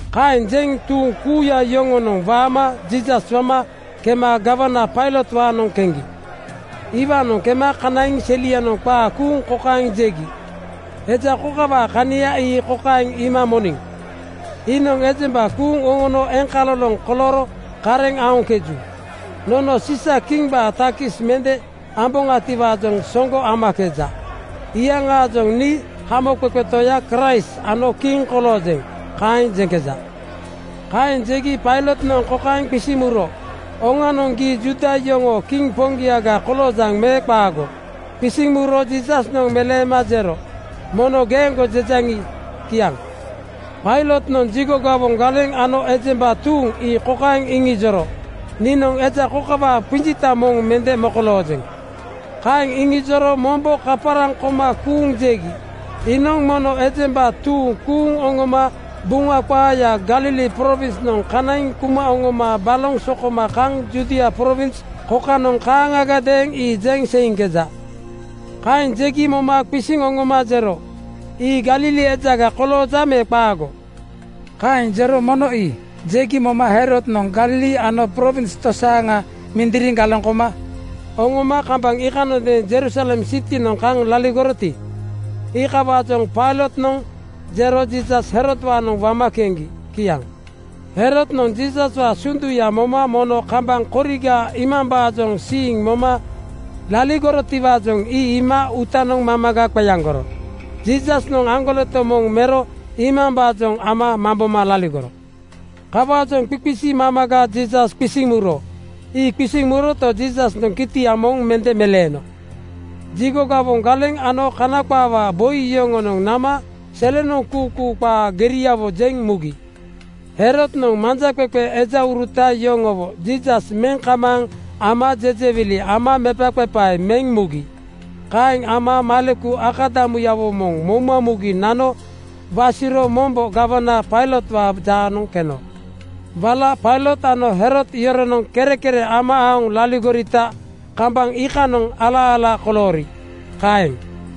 Kaeŋ jeŋ tuuŋ kuuya yoŋonoŋ waama Jiisas wama kema gawana Pailotwaanoŋ keŋgi. Iwaanoŋ kema kanaiŋ selianoŋ qaa kuuŋ kokaeŋ jegi, “Eja kokawaa kania ii kokaeŋ iima moniŋ: Iinoŋ ejemba kuuŋ oŋono eŋkaloloŋ kolooro kareŋ aoŋkeju. Nono Siisa-kimbaa takis mende amboŋatiwaajoŋ soŋgo amakeja. Iyaŋaajoŋ ‘Nii Hamoqeqe Toya Kraist ano kiŋ koloojeŋ,’ kaeŋ jeŋkeja.” Kaeŋ jegi Pailotnoŋ kokaeŋ qisiŋ muro, “Oŋanoŋ, gii Juuda yoŋoo kiŋ poŋgiaga koloojaŋ me qaago?” Qisiŋ muro Jiisasnoŋ meleema jero, “Mono geeŋgo jejaŋi, kiaŋ.” Pailotnoŋ jigo gawoŋ galeŋ ano ejemba tuuŋ ii kokaeŋ iŋijoro, “Niinoŋ eja kokawaa qinjita moŋ mende mokoloojeŋ.” Kaeŋ iŋijoro mombo kaparaŋ koma kuuŋ jegi, “Iinoŋ mono ejemba tuuŋ kuuŋ oŋoma Buŋa qaaya Galili prowinsnoŋ kanaiŋ kuma oŋoma baloŋ sokoma kaŋ Judia prowins kokanoŋ kaaŋagadeeŋ ii jeŋ seiŋkeja.” Kaeŋ jegi moma qisiŋ oŋoma jero, “Ii Galili ejaga kolooja me qaago?” Kaeŋ jero “Mono ii!” jegi moma Herodnoŋ Galili ano prowins tosaaŋa mindiriŋ galeŋ koma oŋoma kambaŋ iikanondeeŋ Jerusalem sitinoŋ kaŋ laligoroti, iikawaajoŋ Pailotnoŋ jero Jiisas Herodwaanoŋ wama keŋgi. Kiaŋ. Herodnoŋ Jiisaswaa sunduya moma mono kambaŋ koriga iimambaajoŋ siiŋ moma laligorotiwaajoŋ ii iima uutanoŋ mamaga qeaŋgoro. Jiisasnoŋ aŋgoleto moŋ mero iimambaajoŋ ama mamboma laligoro. Kawaajoŋ qiqisi mamaga Jiisas qisiŋ muro. Ii qisiŋ muroto, Jiisasnoŋ kitia moŋ mende meleeno. Jigo gawoŋ galeŋ ano Kana qaawaa boi yoŋonoŋ nama selenoŋ kuukuu qaa geriawo jeŋ mugi. Herodnoŋ manjaqeqe ejauruta yoŋowo Jiisas meŋ kamaaŋ ama jejewili ama mepaqepae meŋ mugi. Kaeŋ ama maleku akadamuyawo moŋ mouma mugi nano wasiro mombo gawana Pailotwaa jaanoŋ keno. Wala Pailot ano Herod yoronoŋ kerekere ama aoŋ laligorita kambaŋ iikanoŋ ala-ala koloori. Kaeŋ.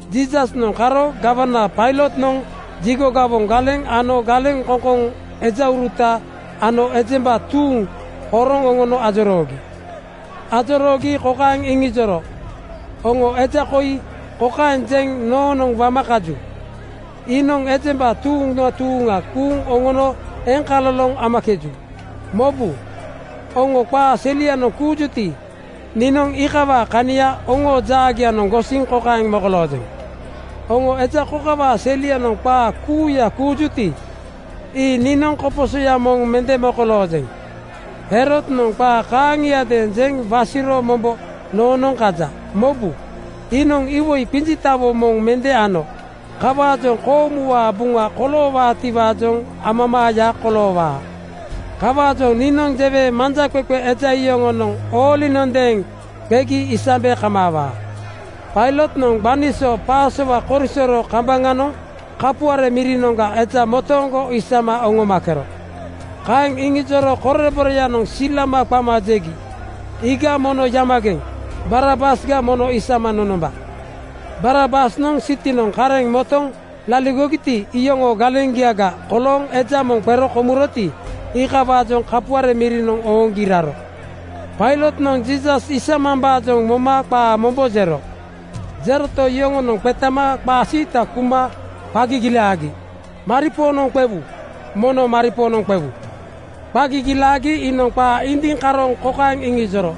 Jiisasnoŋ karo gawana Pailotnoŋ jigo gawoŋ galeŋ ano galeŋkoŋkoŋ ejauruta ano ejemba tuuŋ horoŋ oŋono ajoroogi. Ajoroogi kokaeŋ iŋijoro, “Oŋo eja koi kokaeŋ jeŋ noonoŋ wama kaju, ‘Iinoŋ ejemba tuuŋa tuuŋa kuuŋ oŋono eŋkaloloŋ amakeju.’ Mobu! Oŋo qaa selianoŋ kuujuti, niinoŋ iikawaa kania oŋoo jaagianoŋ gosiŋ kokaeŋ mokoloojeŋ: Oŋo eja kokawaa selianoŋ qaa kuuya kuujuti, ii niinoŋ koposoya moŋ mende mokoloojeŋ. Herodnoŋ qaa kaaŋiadeeŋ jeŋ wasiro mombo nonoonoŋ kaja. Mobu, iinoŋ iwoi qinjitawo moŋ mende ano. Kawaajoŋ koomuwaa buŋa koloowaatiwaajoŋ amamaaya koloowaa. Kawaajoŋ niinoŋ jewe manjaqeqe eja yoŋonoŋ oolinondeeŋ qegi isambe kamaawaa.” (Pailotnoŋ gbani so Pasowa korisoro kambaŋanoŋ kapuare mirinoŋga eja motooŋgo isama oŋomakero.) Kaeŋ iŋijoro koreboreyanoŋ silama qama jegi, “Iiga mono yamageŋ (kozigeŋ)! Barabas mono isama nonomba!” Barabasnoŋ sitinoŋ kareŋ motoŋ laligogiti, iyoŋoo galeŋgiaga kolooŋ eja moŋ qero komuroti, iikawaajoŋ kapuare mirinoŋ ooŋgi raro. Pailotnoŋ Jiisas isamambaajoŋ moma qaa mombo jero. Jeroto, yoŋonoŋ qetama qaa siita kuma qa gigilaagi, “Maripoonoŋ qewu! Mono maripoonoŋ qewu!” Qa gigilaagi iinoŋ qaa indiŋ karooŋ kokaeŋ iŋijoro,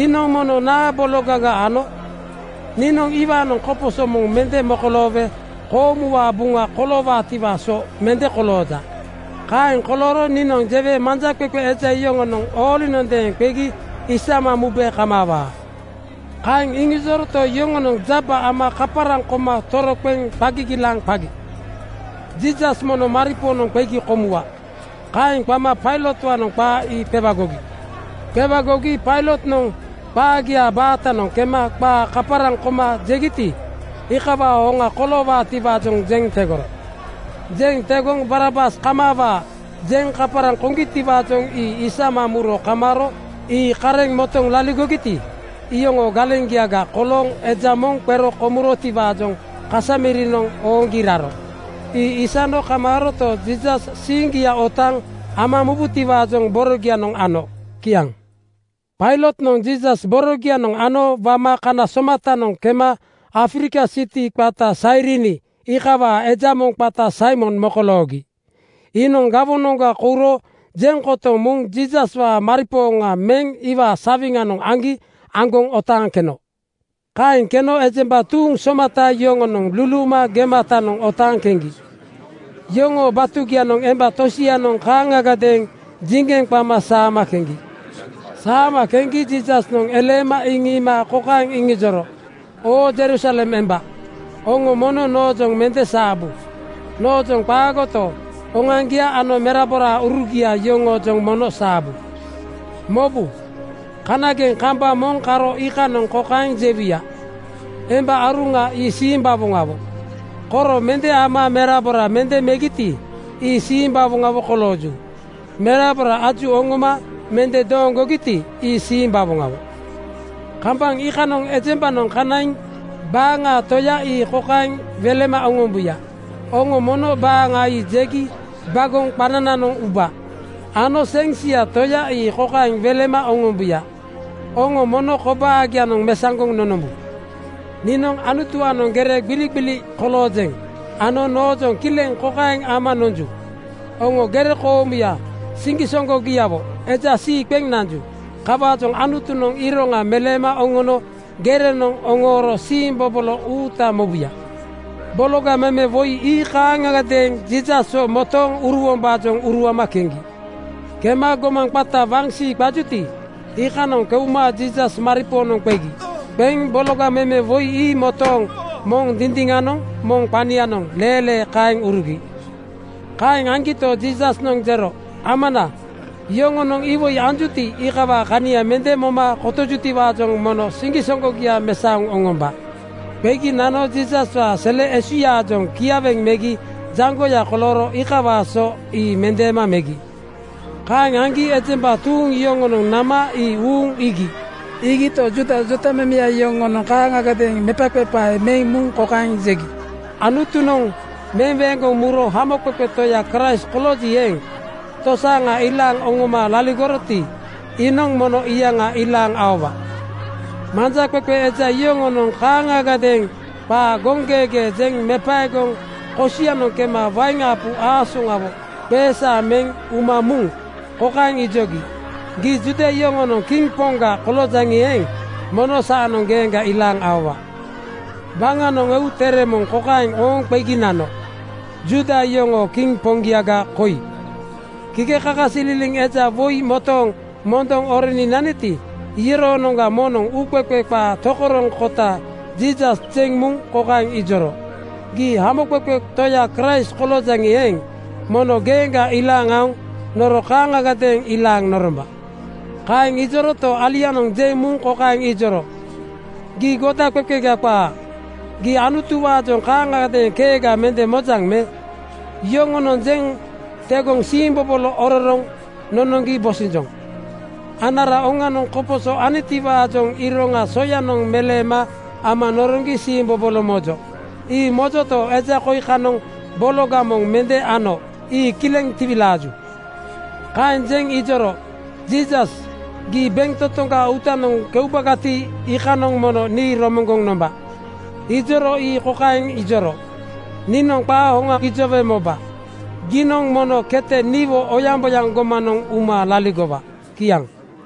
“Iinoŋ mono naa bologaga ano? Niinoŋ iwaanoŋ koposo moŋ mende mokoloowe koomuwaa buŋa koloowaatiwaa so mende kolooja. Kaeŋ kolooro niinoŋ jewe manjaqeqe eja yoŋonoŋ oolinondeeŋ qegi isama mube kamaawaa.” Kaeŋ iŋijoroto, yoŋonoŋ jaba ama kaparaŋ koma toroqeŋ qa gigilaaŋ qagi, ‘Jiisas mono maripoonoŋ qegi komuwa.’ Kaeŋ qama Pailotwaanoŋ qaa ii qewagogi. Qewagogi Pailotnoŋ qaagiaa baatanoŋ kema qaa kaparaŋ koma jegiti, iikawaa hoŋa koloowaatiwaajoŋ jeŋ tegoro. Jeŋ tegoŋ “Barabas kamaawa!” jeŋ kaparaŋ koŋgitiwaajoŋ ii isama muro kamaaro. Ii kareŋ motoŋ laligogiti, iyoŋoo galeŋgiaga kolooŋ eja moŋ qero komurotiwaajoŋ kasa mirinoŋ ooŋgi raro. Ii isano kamaaroto, Jiisas siiŋgia otaaŋ ama mubutiwaajoŋ borogianoŋ ano. Kiaŋ. Pailotnoŋ Jiisas borogianoŋ ano wama kana somatanoŋ kema Afrika siti qata Sairini iikawaa eja moŋ qata Saimon mokoloogi. Iinoŋ gawonoŋga kouro jeŋ kotoŋ muŋ Jiisaswaa maripooŋa meŋ iwaa sawiŋanoŋ aŋgi aŋgoŋ otaaŋ keno. Kaeŋ keno ejemba tuuŋ somata yoŋonoŋ luluuma gematanoŋ otaaŋ keŋgi. Yoŋoo batugianoŋ emba tosianoŋ kaaŋagadeeŋ jiŋgeŋ qama saama keŋgi. Saama keŋgi Jiisasnoŋ eleema iŋiima kokaeŋ iŋijoro, “Oo Jerusalem emba, oŋo mono noojoŋ mende saabu. Noojoŋ qaagoto, oŋoaŋgia ano meraboraurugia yoŋoojoŋ mono saabu. Mobu! Kanageŋ kambaŋ moŋ karo iikanoŋ kokaeŋ jewuya, ‘Emba aruŋa ii simbawoŋawo. Koro mende ama merabora mende megiti, ii simbawoŋawo kolooju. Merabora aju oŋoma mende dooŋgogiti, ii simbawoŋawo.’ Kambaŋ iikanoŋ ejembanoŋ kanaiŋ baaŋa Toya ii kokaeŋ welema oŋombuya, ‘Oŋo mono baaŋa ii jegi bagoŋ qanananoŋ ubu.’ Ano seŋ sia Toya ii kokaeŋ welema oŋombuya, ‘Oŋo mono kobaagianoŋ mesaŋgoŋ nonombu.’ “Niinoŋ Anutuwaanoŋ gere gbiligbili koloojeŋ ano noojoŋ kileŋ kokaeŋ ama nonju. Oŋo gere koomuya siŋgisoŋgogiawo eja sii qeŋ nanju. Kawaajoŋ Anutunoŋ iroŋa meleema oŋono gerenoŋ oŋooro siimbobolo uuta mobuya.” Bologa meme woi ii kaaŋagadeeŋ Jiisaswo motooŋ uruwombaajoŋ uruama keŋgi. Kema gomaŋ qata Waŋsii qajuti, iikanoŋ keuma Jiisas maripoonoŋ qegi. Qeŋ bologa meme woi ii motooŋ moŋ dindiŋanoŋ moŋ qanianoŋ leelee kaeŋ urugi. Kaeŋ aŋgito, Jiisasnoŋ jero, “Amana, yoŋonoŋ iwoi anjuti, iikawaa kania mende moma kotojutiwaajoŋ mono siŋgisoŋgogia mesaoŋ oŋomba.” Qegi nano Jiisaswaa sele esuyaajoŋ kiaweŋ megi jaŋgoya kolooro iikawaa so ii mendeema megi. Kaeŋ aŋgi ejemba tuuŋ yoŋonoŋ nama ii uuŋ iigi. Iigito, Juuda jotamemeya yoŋonoŋ kaaŋagadeeŋ mepaqepae meŋ muŋ kokaeŋ jegi, “Anutunoŋ meweeŋgoŋ muro Hamoqeqe Toya Kraist kolooji eeŋ, tosaaŋa ilaaŋ oŋoma laligoroti, iinoŋ mono iyaŋa ilaaŋ aowa.” Manjaqeqe eja yoŋonoŋ kaaŋagadeeŋ qaa goŋgeegee jeŋ mepaegoŋ kosianoŋ kema wain apu aasoŋawo qeesaaŋ meŋ uma muŋ kokaeŋ ijogi, “Gii Juuda yoŋoonoŋ kiŋ poŋga koloojaŋi eeŋ, mono saanoŋ geeŋga ilaaŋ aowa.” Waŋanoŋ eu tere moŋ kokaeŋ ooŋ qegi nano, “Juuda yoŋoo kiŋ poŋgiaga koi.” Kikekakasililiŋ eja woi motooŋ mondoŋ oroni naniti, iyoroonoŋga moŋnoŋ uuqeqe qaa tokoroŋkota Jiisas jeŋ muŋ kokaeŋ ijoro, “Gii Hamoqeqe Toya Kraist koloojaŋi eeŋ, mono geeŋga ilaaŋ aoŋ noro kaaŋagadeeŋ ilaaŋ noromba.” Kaeŋ ijoroto, alianoŋ jeŋ muŋ kokaeŋ ijoro, “Gii godaqeqega qaa. Gii Anutuwaajoŋ kaaŋagadeeŋ keega mende mojaŋ me? Yoŋonoŋ jeŋ tegoŋ siimbobolo ororoŋ nonoŋgi bosinjoŋ. Anara oŋanoŋ koposo anitiwaajoŋ iroŋa soyanoŋ meleema ama noroŋgi siimbobolo mojo. Ii mojoto, eja koi kanoŋ bologa moŋ mende ano ii kileŋ tiwilaaju.” Kaeŋ jeŋ ijoro, “Jiisas, gii bentotoŋgaa uutanoŋ keubagati, iikanoŋ mono nii romoŋgoŋ nomba.” Ijoro ii kokaeŋ ijoro, “Niinoŋ qaa hoŋa gijowe moba: Giinoŋ mono kete niwo oyaŋboyaŋ gomanoŋ uma laligowa.” Kiaŋ.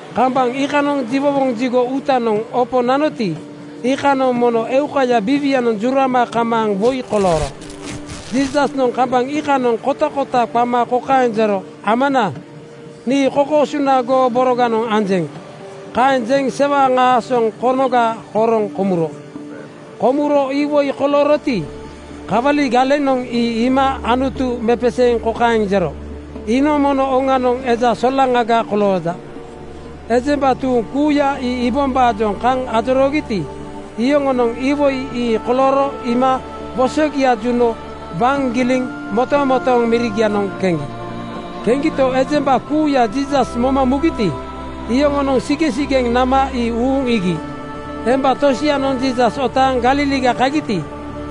Kambaŋ iikanoŋ jiwowoŋ jigo uutanoŋ opo nanoti, iikanoŋ mono eukaya biiwianoŋ jurama kamaaŋ woi kolooro. Jiisasnoŋ kambaŋ iikanoŋ kotakota qama kokaeŋ jero, “Amana, nii kokoosuna goo boroganoŋ anjeŋ.” Kaeŋ jeŋ sewaŋ aasoŋ konoga horoŋ komuro. Komuro iwoi kolooroti, kawali galenoŋ ii iima Anutu mepeseeŋ kokaeŋ jero, “Iinoŋ mono oŋanoŋ eja solaŋaga kolooja.” Ejemba tuuŋ kuuya ii iibombaajoŋ kaŋ ajoroogiti, iyoŋonoŋ iwoi ii kolooro iima wosogia juno waŋ giliŋ motomotooŋ mirigianoŋ keŋgi. Keŋgito, ejemba kuuya Jiisas moma mugiti, iyoŋonoŋ sigeŋsigeŋ nama ii uuŋ iigi. Emba tosianoŋ Jiisas otaaŋ Galiliga kagiti,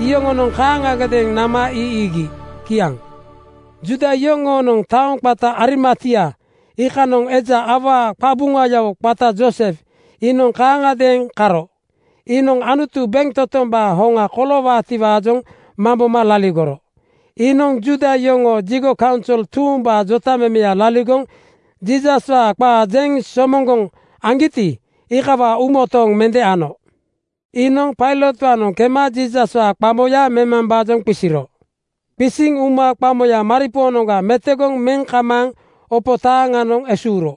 iyoŋonoŋ kaaŋagadeeŋ nama ii iigi. Kiaŋ. Juuda yoŋoonoŋ taoŋ qata Arimatia iikanoŋa eja awaa qabuŋayawo qata Joosef iinoŋ kaaŋagadeeŋ karo. Iinoŋ Anutu bentotombaa hoŋa koloowaatiwaajoŋ mamboma laligoro. Iinoŋ Juuda yoŋoo jigo kaunsol tuumbaa jotamemeya laligoŋ Jiisaswaa qaa jeŋ somoŋgoŋ aŋgiti, iikawaa uumotooŋ mende ano. Iinoŋ Pailotwaanoŋ kema Jiisaswaa qamoya memambaajoŋ qisiro. Qisiŋ uma qamoya maripoonoŋga metegoŋ meŋ kamaaŋ opo taaŋanoŋ esuuro.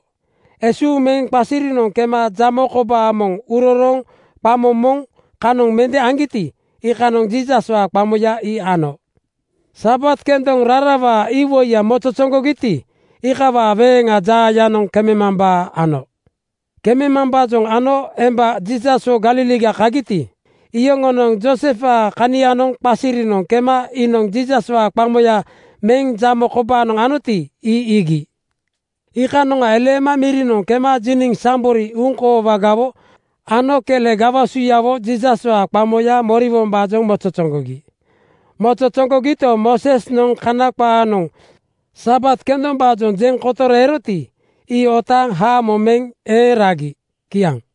Esuuŋ meŋ qasirinoŋ kema jamo kobaa moŋ urorooŋ qamo moŋ kanoŋ mende aŋgiti, iikanoŋ Jiisaswaa qamoya ii ano. Sabat kendoŋ rarawaa iwoiya mozozoŋgogiti, (nemuŋgawoŋ) iikawaa weeŋa jaayanoŋ kememambaa ano. Kememambaajoŋ ano emba Jiisaswo Galiliga kagiti, iyoŋonoŋ Joosefwaa kanianoŋ qasirinoŋ kema iinoŋ Jiisaswaa qamoya meŋ jamo kobaanoŋ anoti, ii iigi. Iikanoŋa eleema mirinoŋ kema jiniŋ sambori uŋkoowagawo ano kele gawasuyawo Jiisaswaa qamoyanoŋ moriwombaajoŋ mozozoŋgogi. Mozozoŋgogito, Moosesnoŋ Kana qaanoŋ Sabat kendombaajoŋ jeŋ kotoro eroti, ii otaaŋ haamo meŋ eeŋ ragi. Kiaŋ.